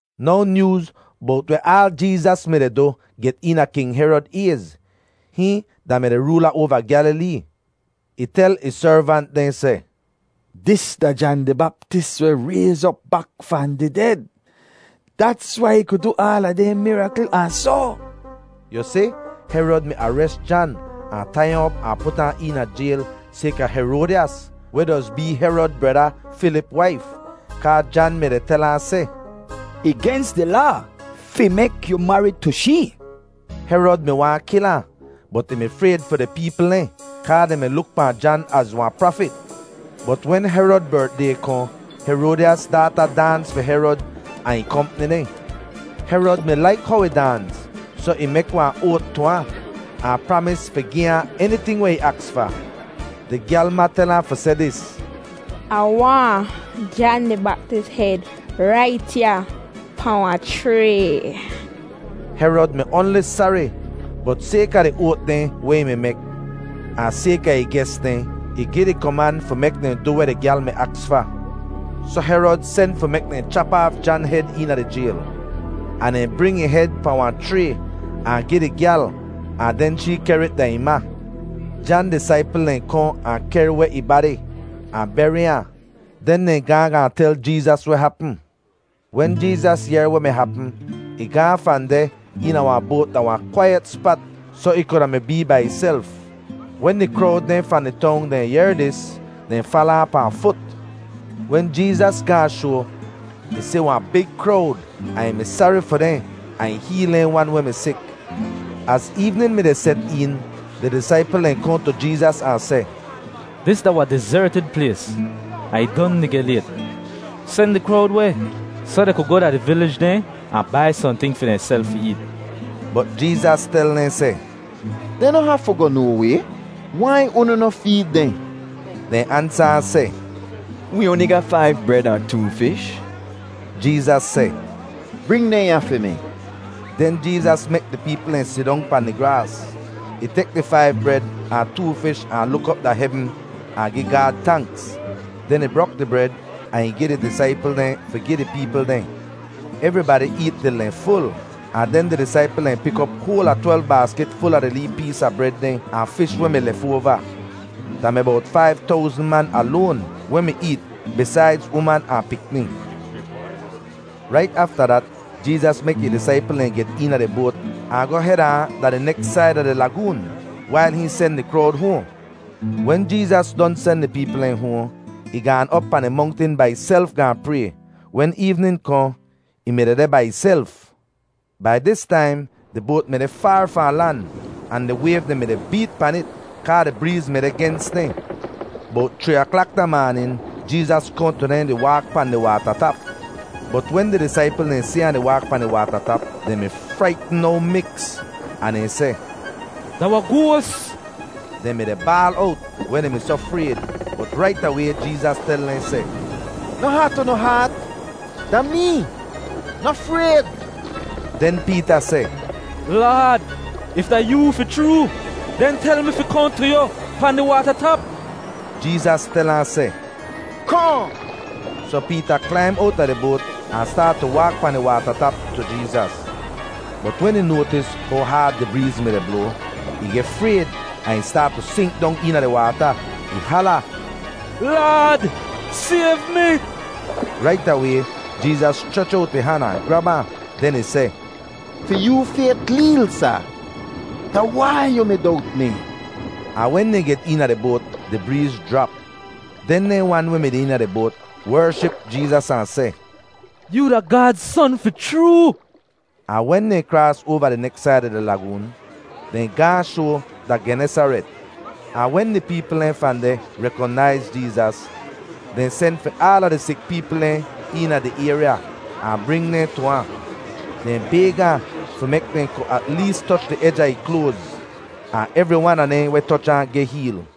Now nyooz bowt weh aal Jeezas mi-di du get eena King Herod ayz. Hihn da-mi di roola oava Gyalilee. Ih tel ih servant dehn seh, “Dis da Jan di Baptis weh rayz op bak fahn di ded. Dats wai ih ku du aala dehn mirakl ahn soh.” Yu si, Herod mi ares Jan ahn tai ahn op ahn put ahn eena jayl sayka Heroadyas, weh doz bee Herod breda Filip waif. Kaa Jan mi-di tel ahn seh, “Ih gens di laa fi mek yu marid tu shee.” Herod mi waahn kil ahn, bot ih mi frayd fi di peepl dehn kaa dehn mi luk pahn Jan az wahn prafit. Bot wen Herod bertday kohn, Heroadyas daata daans fi Herod ahn ih kompni dehn. Herod mi laik how ih daans, soh ih mek wahn oat tu ahn, ahn pramis fi gi ahn eniting weh ih aks fa. Di gyal ma tel ahn fi seh dis, “Ah waahn Jan di Baptis hed rait ya pahn wahn chray.” Herod mi oanli sari, bot sayka di oat dehn weh ih mi mek, ahn sayka ih ges dehn, ih gi di koman fi mek dehn du weh di gyal mi aks fa. Soh Herod sen fi mek dehn chap aaf Jan hed eena di jayl. Ahn dehn bring ih hed pahn wahn chray ahn gi di gyal, ahn den shee kehr it da ih ma. Jan disaipl dehn kohn ahn kehr weh ih badi ahn beri ahn. Den dehn gaahn gaahn tel Jeezas weh hapm. Wen Jeezas yehr weh mi hapm, ih gaahn fahn deh eena wahn boat da wahn kwaiyet spat soh ih kuda mi bee bai ihself. Wen di krowd dehn fahn di tong dehn yehr dis, dehn fala ahn pahn fut. Wen Jeezas gaahn shoa, ih si wahn big krowd ahn ih mi sari fi dehn ahn ih heel dehn wan weh mi sik. Az eevnin mi-di set een, di disaipl dehn kohn tu Jeezas ahn seh, “Dis da wahn dizertid plays, ahn ih don di geh layt. Sen di krowd weh, soh dehn ku goh da di vilij dehn ahn bai sohnting fi dehnself fi eet.” Bot Jeezas tel dehn seh, “Dehn noh hafu goh no way. Wai unu noh feed dehn?” Dehn ansa ahn seh, “Wee oanli ga faiv bred ahn too fish.” Jeezas seh, “Bring dehn ya fi mi.” Den Jeezas mek di peepl dehn sidong pahn di graas. Ih tek di faiv bred ahn too fish ahn luk op da hevn ahn gi Gaad tanks. Den ih brok di bred ahn ih gi di disaipl dehn fi gi di peepl dehn. Evribadi eet til dehn ful, ahn den di disaipl dehn pik op hoal a twelv baaskit ful a di lee pees a bred dehn ahn fish weh mi lefoava. Da mi bowt faiv towzn man aloan weh mi eet bisaidz uman ahn pikni. Rait afta dat Jeezas mek ih disaipl dehn get eena di boat ahn goh heda ahn da di neks said a di lagoon wail hihn sen di krowd hoahn. Wen Jeezas don sen di peepl dehn hoahn, ih gaan op pahn di mongtin bai ihself gaahn pray. Wen eevnin kohn, ih mi dehdeh bai ihself. Bai dis taim di boat mi deh faar fahn lan, ahn di wayv dehn mi-di beet pan it kaa di breez mi deh gens dehn. Bowt chree aklak da maanin Jeezas kohn tu dehn di waak pahn di waata tap. Bot wen di disaipl dehn si ahn di waak pahn di waata tap, dehn mi fraitn no miks, ahn dehn seh, “Da wahn goas!” Dehn mi-di baal owt weh dehn mi soh frayd. Bot rait away Jeezas tel dehn seh, “Noh hat unu haat. Da mee. Noh frayd.” Den Peeta seh, “Laad, if da yoo fi chroo, den tel mi fi kohn tu yu pahn di waata tap.” Jeezas tel ahn seh, “Kohn!” Soh Peeta klaim owta di boat ahn staat tu waak pahn di waata tap tu Jeezas. Bot wen ih noatis how haad di breez mi-di bloa, ih geh frayd ahn ih staat tu sink dong eena di waata. Ih hala, “Laad, sayv mi!” Rait away Jeezas schrech owt ih han ahn grab ahn. Den ih seh, “Fi yoo fayt leel, sa! Da wai yu mi dowt mi?” Ahn wen dehn get eena di boat, di breez jrap. Den dehn wan weh mi deh eena di boat wership Jeezas ahn seh, “Yoo da Gaad Son fi chroo!” Ahn wen dehn kraas oava di neks said a di lagoon, dehn gaahn shoa da Genesaret. Ahn wen di peepl dehn fahn deh rekonaiz Jeezas, dehn sen fi aala di sik peepl dehn eena di ayrya ahn bring dehn tu ahn. Dehn bayg ahn fi mek dehn ku at lees toch di ej a ih kloaz, ahn evri wan a dehn weh toch ahn geh heel.